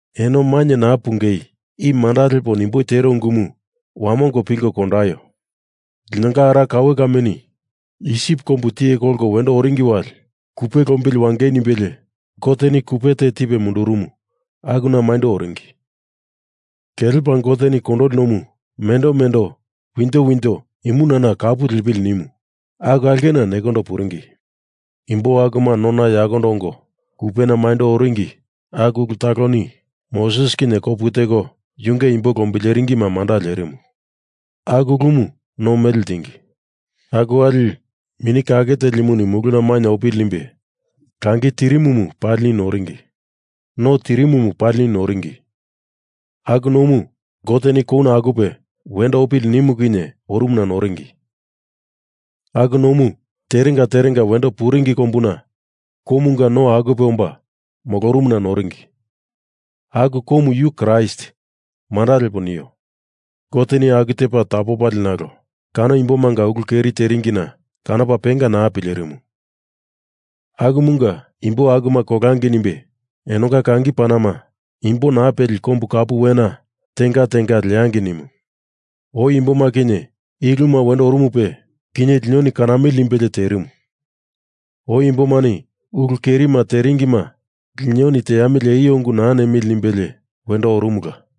Eno mainye naa pungei i manda lepo nimboi tero ungumu wamongo pilko kondaio. Linonga ara kaue kame Isip kombu tiye kolko wendo oringi wali kupe lombili wangei nimbelie Goteni kupe te tipe mundurumu akuna maindo oringi. Kelepa Goteni Kondoli Nomu mendo mendo winjo winjo imunana kapu lepili nimu aku aulkena nekondo puringi. Imbo akuma nona yakondo ongo kupena maindo oringi aku ulu taloni Moses kinye kopu teko yunge imbo lombileringima manda lerimu. Aku ulumu no mele ltingi. Aku wali Mini Kake Telimuni muluna mainye opili nimbe langi tirimumu palini noringi. No tirimumu palini noringi. Aku nomu Goteni kouna akupe wendo opili nimu kinye orumuna noringi. Aku nomu terenga terenga wendo puringi kombuna koumunga no akupe omba molorumuna noringi. Aku koumu yu Kraist manda lepo nio. Goteni aku tepa tapopalie nalo kano imbomanga ulu keri teringina kanopa penga naa pilerimu. Akumunga imbo akuma kolangei nimbe enonga kangi panama imbo naa peli kombu kapu wena tenga tenga leangei nimu. Oi imboma kinye i uluma wendo orumupe, kinye linoni kanamili nimbelie terimu. Oi imbomani ulu kerima teringima lino teamili eio ungu naa nemili nimbelie wendo orumula.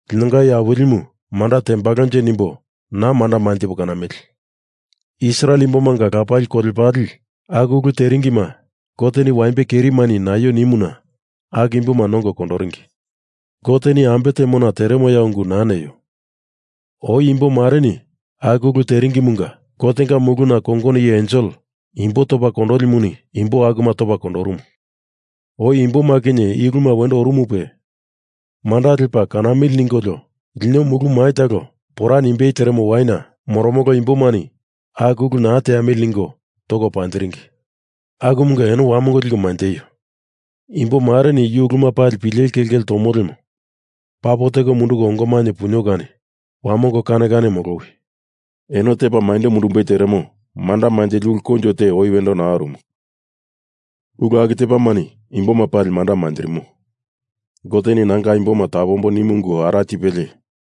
Linonga Iye Awilimu manda tembalonje nimbo naa manda manjipo kanamili. Israel imbomanga lapali kolepale aku ulu teringima Goteni waimbe kerimani naio nimuna aku imboma nongo kondoringi. Goteni ambe temona teremoya ungu naa neio. Oi imbomareni aku ulu teringimunga Gotenga muluna kongono iye ensel imbo topa kondolimuni imbo akuma topa kondorumu. Oi imboma kinye i uluma wendo orumupe manda lepa kanamili ningolio lino mulu mai talo pora nimbei teremo waina moromolo imbomani aku ulu naa teamili ningo toko panjiringi. Akumunga eno wamongo liko manjeio. Imboreni yu uluma pileli kelkele tonio lemo papo teko munduko ongo mainye punio kani wamongo kane kane molowi. Eno tepa maindo mundumbei teremo manda manjili ulu koinjo te oi wendo naa orumu. Ulu aku tepamani imboma pali manda manjirimo. Goteni nanga imboma tapombo nimu ungu ara tipelie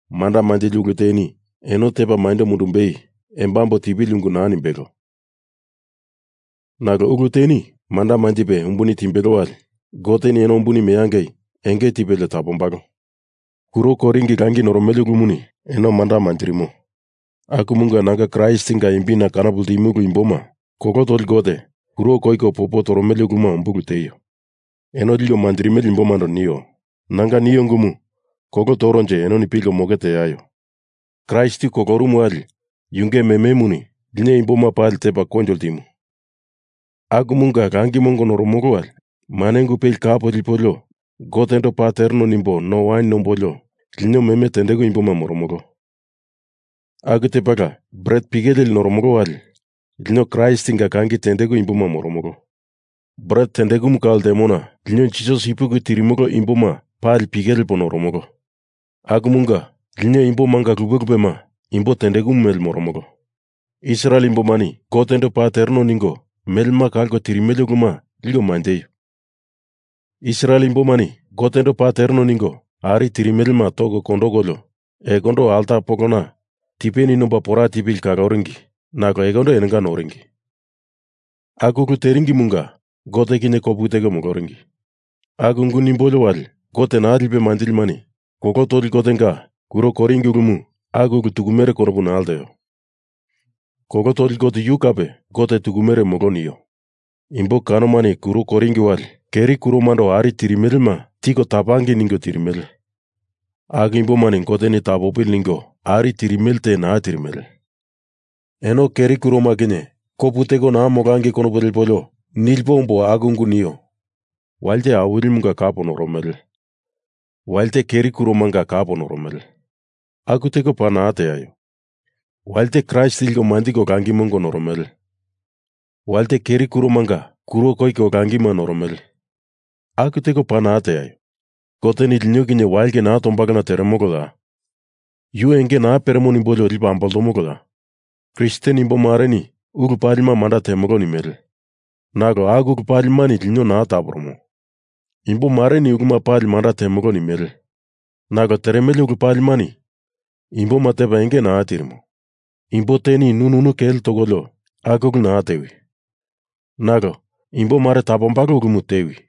manda manjili ulu teni eno tepa maindo mundumbei embambo tipili ungu naa nimbelo. Nalo ulu teni manda manjipe umbuni timbelo wali Goteni eno umbuni meangei enge tipelie tapombalo. Kuro koiringi langi noromele ulumuni eno manda manjirimo. Akumunga nanga Kraistinga imbina kanopo ltimolo imboma, kolo toli gote kuro koiko popo toromele uluma umbulu tieio. Eno liko manjirimele imbomando nio. Nanga nio ungumu kolo toronje enoni pilko moke teaio. Kraist yu kolorumu wali yunge mememuni lino imbo palima tepa koinjo ltimu. Akumunga langi mongo noromolo wali mane ungu peli kap lipolio Gotendo paa tereno nimbo no wain nombolio lino meme tendeku imboma moromolo. Aku tepala bret pike leli noromolo wali lino Kraistinga kangi tendeku imboma moromolo. Bret tendekumu kau ltemona lino Jisas ipuki tirimolo imboma pali pike lepo noromolo. Akumunga lino imbo manga lupe lupema imbo tendeku mele moromolo. Israel imbomani Gotendo paa tereno ningo melema kalko tirimele uluma liko manjeio. Israel imbomani Gotendo paa tereno ningo ari tirimelema toko kondokolio ekondo alta polona tipe nomba pora tipili ningo kaloringi nalo ekondo enonga noringi. Aku ulu teringimunga Gote kinye kopu teko moloringi. Nalo aku ungu nimbolio wali Gote naa lipe manjilimani kolo toli gotemanga kuro koiringi ulumu aku ulu tukumere konopu naa lteo. Kolo toli gote yu kape gote tukumere molo nio. Imbo kanomani kuro koiringi wali keri kuromando ari tirimelema tiko tapangei ningo teremele. Aku imbomani Goteni tapopili ningo ari tirimele te naa tirimele. Eno keri kuroma kinye kopu teko naa molangei konopu lepolio nilipo ombo aku ungu nio. Walite Awilimunga kap noromele. Walite keri kuromanga kap noromele. Aku teko paa naa teaio. Walite Kraist liko manjiko langi mongo noromele. Walite keri kuromanga kuro koiko langima noromele. Aku teko paa naa teaio. Goteni lino kinye wailke naa tombalona teremoloya? Yu enge naa peremo nimbolio lipo amboltomoloya? Kristen imbomareni ulu palima manda temolo nimele. Nalo aku ulu palimani lino naa taporomo. Imbomareni ulu palima manda temolo nimele. Nalo teremele ulu palimani imboma tepa enge naa tirimo. Imbo teni nu nunu kele tokolio aku ulu naa tewi. Nalo imbomare tapombalo ulumu tewi.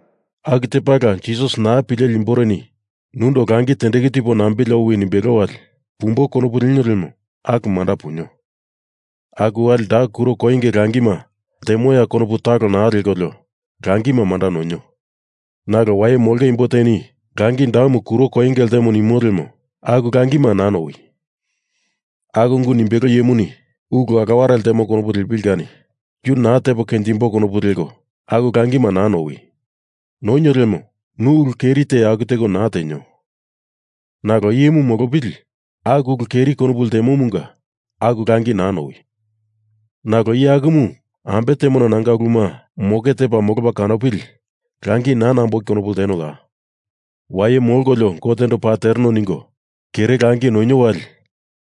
Aku tepala Jisas naa pileli imboreni nundo langi tendeku tipo nambili owi nimbelo wali pumbo konopu lenio lemo aku manda punio. Aku wali da kuro koinge langima ltemoya konopu talo naa lekolio langima manda nonio. Nalo waye molongei imbo teni langi damu kuro koinge ltemo nimo lemo aku langima naa nowi. Aku ungu nimbelo iyemuni ulu aloware ltemo konopu lepili kani yu naa tepo kenjimboi konopu leko aku langima naa nowi. Nonio lemo nu ulu keri te aku teko naa tenio. Nalo iyemu molopili aku ulu keri konopu ltemomunga aku langi naa nowi. Nalo iye akumu ambe temona nanga uluma moke tepa molopa kanopili langi naa namboi konopu ltenoya? Waye molkolio Gotendo paa tereno ningo kere langi nonio wali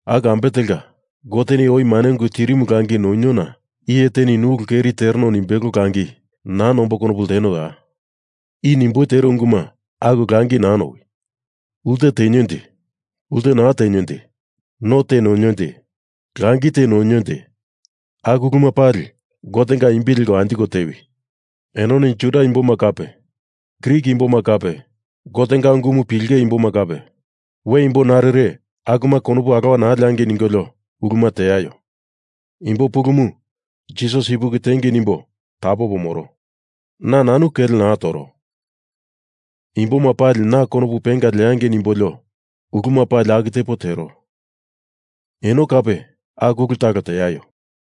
aku ambe telka Goteni oi mane ungu tirimu langi noniona iye teni nu ulu keri tereno nimbelo langi naa namboi konopu ltenoya? I nimboi tero ungumunga aku langi naa nowi. Ulte tenionje. Ulte naa tenionje. No te nonionje. Langi te nonionje. Aku uluma pali Gotenga imbi leko anjiko tewi. Enoni Juda imboma kape Grik imboma kape Gotenga ungumu pilenge imboma kape we imbo narire akuma konopu alowa naa leangei ningolio uluma teaio. Imbo pulumu Jisas ipuki tiengei nimbo tapopo moro. Na nanu kele naa toro. Imboma pali na konopu penga leangei nimbolio uluma pali aku tepo tero. Eno kape aku ulu talo teaio.